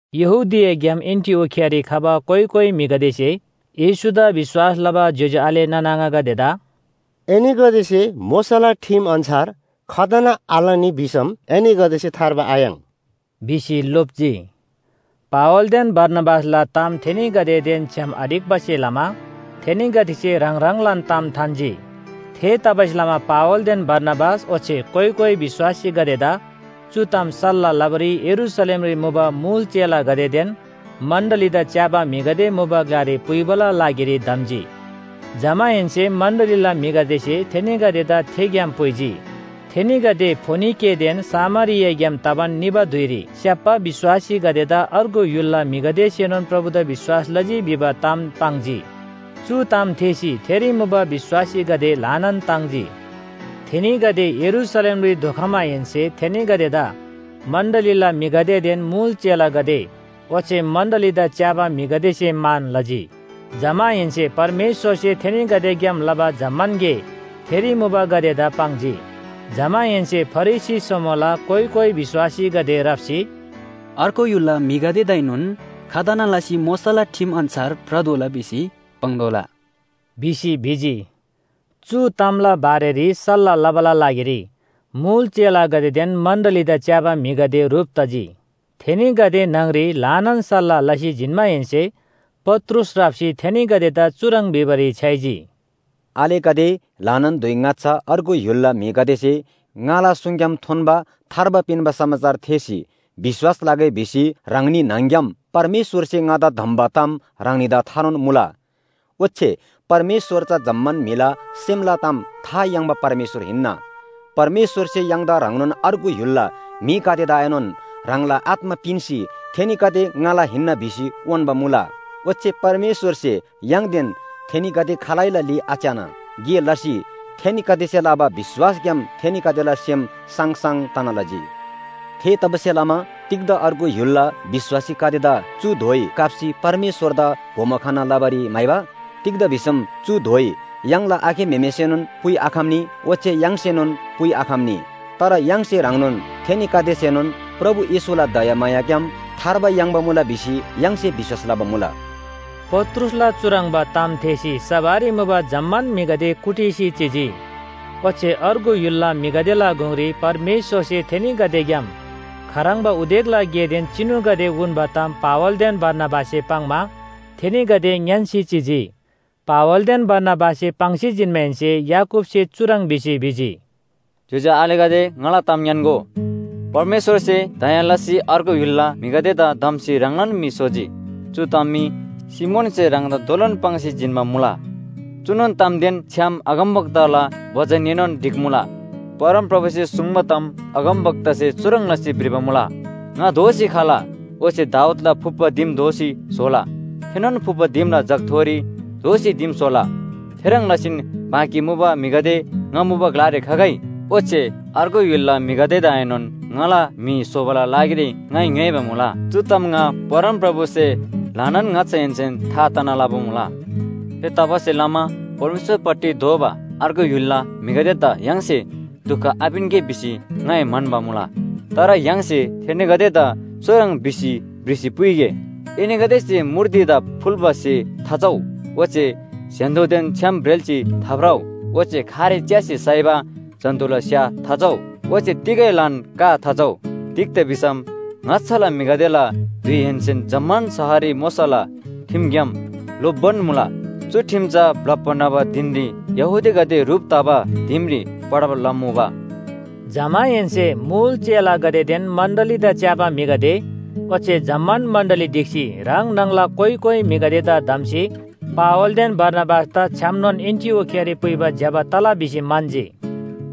यहूदियाग्‍याम एन्‍टिओखियारी खबा कोइ कोइ म्‍हिगदेसे येशूदा विश्‍वास लबा ज्‍योज्‍यो आले नाना आङागदेदा “एनीगदेसे मोशाला ठिम अन्‍छार खतना आलनी भिसम एनीगदेसे थार्बा आयाङ्” भिसी लोप्‍जी। पावलदेन बारनाबासला ताम थेनीगदेदेन छ्‌याम आढिक्‍बासे लमा थेनीगदेसे ह्राङ ह्राङलान ताम थान्‍जी। थेतबासेलमा पावलदेन बारनाबास ओच्‍छे कोइ कोइ विश्‍वासीगदेदा चु ताम सल्‍लाह लबारी यरूशलेमरी मुबा मुल चेलागदेदेन मण्‍डलीदा च्‍याबा म्‍हिगदे मुबा ग्‍लारी पुइबाला लागिरी धम्‍जी। जमाहेन्‍से मण्‍डलीला म्‍हिगदेसे थेनीगदेदा थे ग्‍याम पुइजी। थेनीगदे फोनिकेदेन सामरियाग्‍याम तबान निबा धुइरी स्‍याप्‍बा विश्‍वासीगदेदा अर्गु य्‍हुलला म्‍हिगदेसेनोन प्रभुदा विश्‍वास लजी भिबा ताम पाङ्जी। चु ताम थेःसी थेरी मुबा विश्‍वासीगदे ल्‍हानान ताङ्जी। थेनीगदे यरूशलेमरी धोखमाहेन्‍से थेनीगदेदा मण्‍डलीला म्‍हिगदेदेन मुल चेलागदे ओच्‍छे मण्‍डलीदा च्‍याबा म्‍हिगदेसे मान लजी। जमाहेन्‍से परमेश्‍वरसे थेनीगदेग्‍याम लबा जम्‍मान गे थेरी मुबागदेदा पाङ्जी। जमाहेन्‍से फरिसी समूहला कोइ कोइ विश्‍वासीगदे राप्‍सी, “अर्गु य्‍हुलला म्‍हिगदेदाएनोन खतना लसी मोशाला ठिम अन्‍छार भ्रतोःला भिसी पाङ्तोःला” भिसी भिजी। चु तामला बारेरी सल्‍लाह लबाला लागिरी मुल चेलागदेदेन मण्‍डलीदा च्‍याबा म्‍हिगदे ह्रुप तजी। थेनीगदे न्‍हङरी ल्‍हानान सल्‍लाह लसी जिन्‍माहेन्‍से पत्रुस राप्‍सी थेनीगदेदा चुह्रङ् भिबारी छ्‌याइजी, “आलेगदे, ल्‍हानान धुइ ङाच्‍छा अर्गु य्‍हुलला म्‍हिगदेसे ङाला सुङग्‍याम थोन्‍बा थार्बा पिन्‍बा समाचार थेःसी विश्‍वास लगै भिसी ह्राङनी न्‍हङ‍ग्‍याम परमेश्‍वरसे ङादा धम्‍बा ताम ह्राङनीदा थानोन मुला। ओच्‍छे परमेश्‍वर चा जम्‍मान म्‍हिला सेमला ताम था याङ्बा परमेश्‍वर हिन्‍ना। परमेश्‍वरसे य्‍हाङदा ह्रङ्नोन अर्गु य्‍हुलला म्‍हिगदेदाएनोन ह्राङला आत्‍मा पिन्‍सी थेनीगदे ङाला हिन्‍ना भिसी उन्‍बा मुला। ओच्‍छे परमेश्‍वरसे य्‍हाङदेन थेनीगदे खालैला ली आच्‍याना गे लसी थेनीगदेसे लबा विश्‍वासग्‍याम थेनीगदेला सेम साङसाङ तना लजी। थेतबासेलमा तिग्‍दा अर्गु य्‍हुलला विश्‍वासीगदेदा चु धोइ काप्‍सी परमेश्‍वरदा बोमो खना लबारी म्‍हाइबा? तिग्‍दा भिसम चु धोइ य्‍हाङला आखे म्‍हेमेसेनोन पुइआखम्‍नी ओच्‍छे य्‍हाङसेनोन पुइआखम्‍नी। तर य्‍हाङसे ह्रङ्नोन थेनीगदेसेनोन प्रभु येशूला दयामायाग्‍याम थार्बा याङ्बा मुला भिसी य्‍हाङसे विश्‍वास लबा मुला।” पत्रुसला चुह्रङ्बा ताम थेःसी सभारी मुबा जम्‍मान म्‍हिगदे कुटिसी चिजी, ओच्‍छे अर्गु य्‍हुलला म्‍हिगदेला गुङरी परमेश्‍वरसे थेनीगदेग्‍याम खाह्रङ्बा उदेकला गेदेन चिनुगदे उन्‍बा ताम पावलदेन बारनाबाससे पाङ्‌मा थेनीगदे ङ्‌यान्‍सी चिजी। पावलदेन बारनाबाससे पाङ्सी जिन्‍माहेन्‍से याकूबसे चुह्रङ् भिसी भिजी, “ज्‍योज्‍यो आलेगदे ङाला ताम ङ्‌यान्‍गो, परमेश्‍वरसे दया लसी अर्गु य्‍हुलला म्‍हिगदेदा धम्‍सी ह्राङलान म्‍हि स्‍होजी। चु ताम मी सिमोनसे ह्राङदा दोलोन पाङ्सी जिन्‍बा मुला। चुनोन तामदेन छ्‌याम अगमवक्ताला बचनएनोन ढिक्‍मुला। परमप्रभुसे सुङ्बा ताम अगमवक्तासे चुह्रङ् लसी भ्रिबा मुला, ‘ङा दोःसी खला, ओच्‍छे दाऊदला फुप्‍बा दिम दोःसी स्‍होला, थेनोन फुप्‍बा दिमला जगथोरी दोःसी दिम स्‍होला, थेह्रङ् लसीन बाँकी मुबा म्‍हिगदे ङा मुबा ग्‍लारी खगै, ओच्‍छे अर्गु य्‍हुलला म्‍हिगदेदाएनोन ङाला म्‍हि स्‍होबाला लागिरी ङाइ ङ्‌योइबा मुला। चु ताम ङा परमप्रभुसे ल्‍हानान ङाच्‍छाहेन्‍सेन था तना लबा मुला।’ “थेतबासेलमा परमेश्‍वरपट्टि दोःबा अर्गु य्‍हुलला म्‍हिगदेदा य्‍हाङसे दुख आपिन्‍गे भिसी ङाइ म्‍हन्‍बा मुला। तर य्‍हाङसे थेनीगदेदा चुह्रङ् भिसी भ्रिसी पुइगे, ‘एनीगदेसे मूर्तिदा फुल्‍बा स्‍हे थाचउ। ओच्‍छे स्‍य्‍हान्‍दोदेन छ्‌याम ब्रेल्‍सी थाभ्रउ, ओच्‍छे खारे च्‍यार्सी साइबा जन्‍तुला स्‍या थाचउ, ओच्‍छे तिगैलान का थाचउ।’ तिग्‍दा भिसम ङाच्‍छाला म्‍हिगदेला धुइहेन्‍सेन जम्‍मान शहररी मोशाला ठिमग्‍याम लो‍प्बान मुला, चु ठिम चा ब्‍लप्‍बा न्‍हबा धिनरी यहूदीगदे ह्रुप तबा दिमरी पढब लमुबा।” जमाहेन्‍से मुल चेलागदेदेन मण्‍डलीदा च्‍याबा म्‍हिगदे ओच्‍छे जम्‍मान मण्‍डली ढिक्‍सी ह्राङ न्‍हङला कोइ कोइ म्‍हिगदेदा धम्‍सी पावलदेन बारनाबासदा छ्‌यामनोन एन्‍टिओखियारी पुइबा ज्‍यबा तला भिसी म्‍हन्‍जी।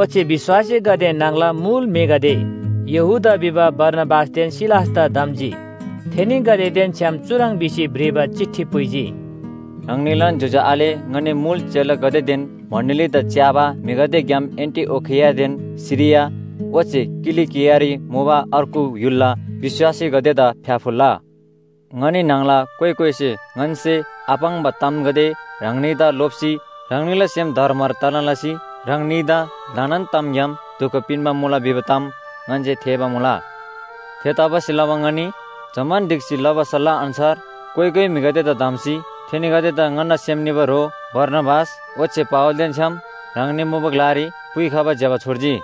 ओच्‍छे विश्‍वासीगदे न्‍हङला मुल म्‍हिगदे यहूदा भिबा बारसाबासदेन सिलासदा धम्‍जी। थेनीगदेदेन छ्‌याम चुह्रङ् भिसी भ्रिबा चिठी पुइजी, “ह्राङनीलान ज्‍योज्‍यो आले ङनी मुल चेलागदेदेन मण्‍डलीदा च्‍याबा म्‍हिगदेग्‍याम एन्‍टिओखियादेन सिरिया ओच्‍छे किलिकियारी मुबा अर्गु य्‍हुलला विश्‍वासीगदेदा फ्‍याफुल्‍ला। “ङनी न्‍हङला कोइ कोइसे ङन्‍से आपाङ्बा तामगदे ह्राङनीदा लोप्‍सी ह्राङनीला सेम धरमर तना लसी ह्राङनीदा ल्‍हानान तामग्‍याम दुख पिन्‍बा मुला भिबा ताम ङन्‍से थेःबा मुला। थेतबासेलमा ङनी जम्‍मान ढिक्‍सी लबा सल्‍लाह अन्‍छार कोइ कोइ म्‍हिगदेदा धम्‍सी थेनीगदेदा ङन्‍ना सेम निबा ह्रो बारनाबास ओच्‍छे पावलदेन छ्‌याम ह्राङनी मुबा ग्‍लारी पुइखबा ज्‍यबा छोर्जी।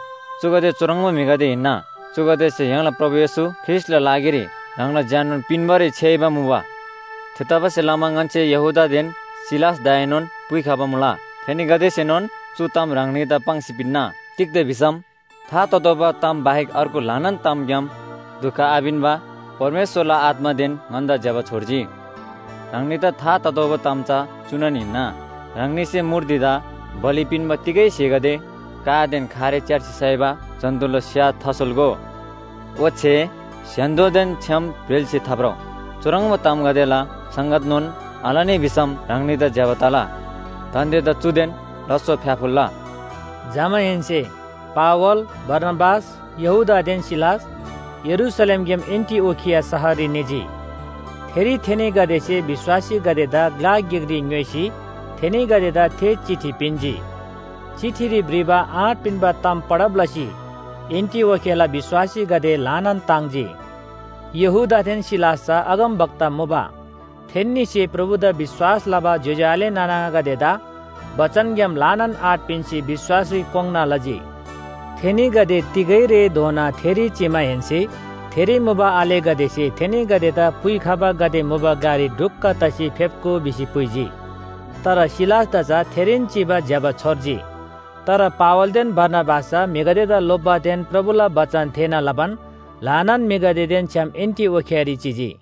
चुगदे चुह्रङ्बा म्‍हिगदे हिन्‍ना, चुगदेसे य्‍हाङला प्रभु येशू ख्रीष्‍टला लागिरी ह्राङला ज्‍याननोन पिन्‍बारी छ्‌याइबा मुबा। थेतबासेलमा ङन्‍से यहूदादेन सिलासदाएनोन पुइखबा मुला। थेनीगदेसेनोन चु ताम ह्राङनीदा पाङ्सी पिन्‍ना। तिग्‍दा भिसम था ततोःबा ताम बाहेक अर्गु ल्‍हानान तामग्‍याम दुख आपिन्‍बा परमेश्‍वरला आत्‍मादेन ङन्‍दा ज्‍यबा छोर्जी। ह्राङनीदा था ततोःबा ताम चा चुनोन हिन्‍ना, ह्राङनीसे मूर्तिदा बलि पिन्‍बा तिगै स्‍हेगदे, कादेन खारे च्‍यार्सी साइबा जन्‍तुला स्‍या थासोल्‍गो, ओच्‍छे स्‍य्‍हान्‍दोदेन छ्‌याम ब्रेल्‍सी थाभ्रउ। चुह्रङ्बा तामगदेला संगतनोन आलनी भिसम ह्राङनीदा ज्‍यबा तला। दान्‍देदा चुदेन लास्‍सो फ्‍याफुल्‍ला।” जमाहेन्‍से पावल, बारनाबास, यहूदादेन सिलास यरूशलेमग्‍याम एन्‍टिओखिया शहररी निजी। थेरी थेनीगदेसे विश्‍वासीगदेदा ग्‍ला गिकरी ङ्‌योइसी थेनीगदेदा थे चिठी पिन्‍जी। चिठीरी भ्रिबा आँट पिन्‍बा ताम पढब लसी एन्‍टिओखियाला विश्‍वासीगदे ल्‍हानान ताङ्जी। यहूदादेन सिलास चा अगमवक्ता मुबा। थेन्‍नीसे प्रभुदा विश्‍वास लबा ज्‍योज्‍यो आले नाना आङागदेदा बचनग्‍याम ल्‍हानान आँट पिन्‍सी विश्‍वासरी कोङ्‌ना लजी। थेनीगदे तिगै रेधोना थेरी चिमाहेन्‍से थेरी मुबा आलेगदेसे थेनीगदेदा पुइखबागदे मुबा ग्‍लारी ढुक्‍क तसी फेप्‍गो भिसी पुइजी। तर सिलासदा चा थेरीन चिबा ज्‍यबा छोर्जी। तर पावलदेन बारनाबास चा म्‍हिगदेदा लोप्‍बादेन प्रभुला बचन थेःना लबान ल्‍हानान म्‍हिगदेदेन छ्‌याम एन्‍टिओखियारी चिजी।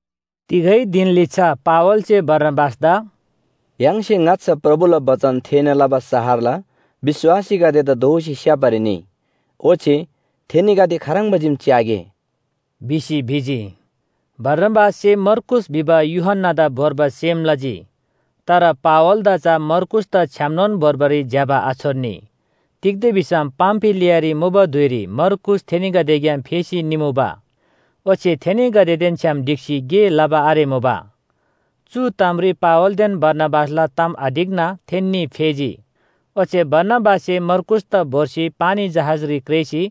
तिगै धिन लिच्‍छा पावलसे बारनाबासदा “य्‍हाङसे ङाच्‍छा प्रभुला बचन थेःना लबा शहरला विश्‍वासीगदेदा दोःसी स्‍याप्‍बारी निइ ओच्‍छे थेनीगदे खाह्रङ्बा चीम च्‍यागे” भिसी भिजी। बारनाबाससे मर्कूस भिबा यूहन्‍नादा भोर्बा सेम लजी। तर पावलदा चा मर्कूसदा छ्‌यामनोन भोर्बारी ज्‍यबा आछोर्नी, तिग्‍दा भिसम पामफिलियारी मुबा धुइरी मर्कूस थेनीगदेग्‍याम फेसी निमुबा, ओच्‍छे थेनीगदेदेन छ्‌याम ढिक्‍सी गे लबा आरेमुबा। चु तामरी पावलदेन बारनाबासला ताम आढिक्‍ना थेन्‍नी फेजी। ओच्‍छे बारनाबाससे मर्कूसदा भोर्सी पानी जहाजरी क्रेःसी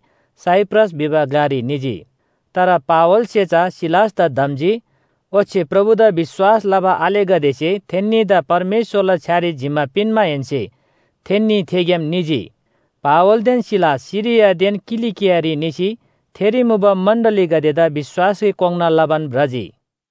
साइप्रस भिबा ग्‍लारी निजी। तर पावलसे चा सिलासदा धम्‍जी, ओच्‍छे प्रभुदा विश्‍वास लबा आलेगदेसे थेन्‍नीदा परमेश्‍वरला छ्‌यारी जिम्‍मा पिन्‍माहेन्‍से थेन्‍नी थेग्‍याम निजी। पावलदेन सिलास सिरियादेन किलिकियारी निसी थेरी मुबा मण्‍डलीगदेदा विश्‍वासरी कोङ्‌ना लबान भ्रजी।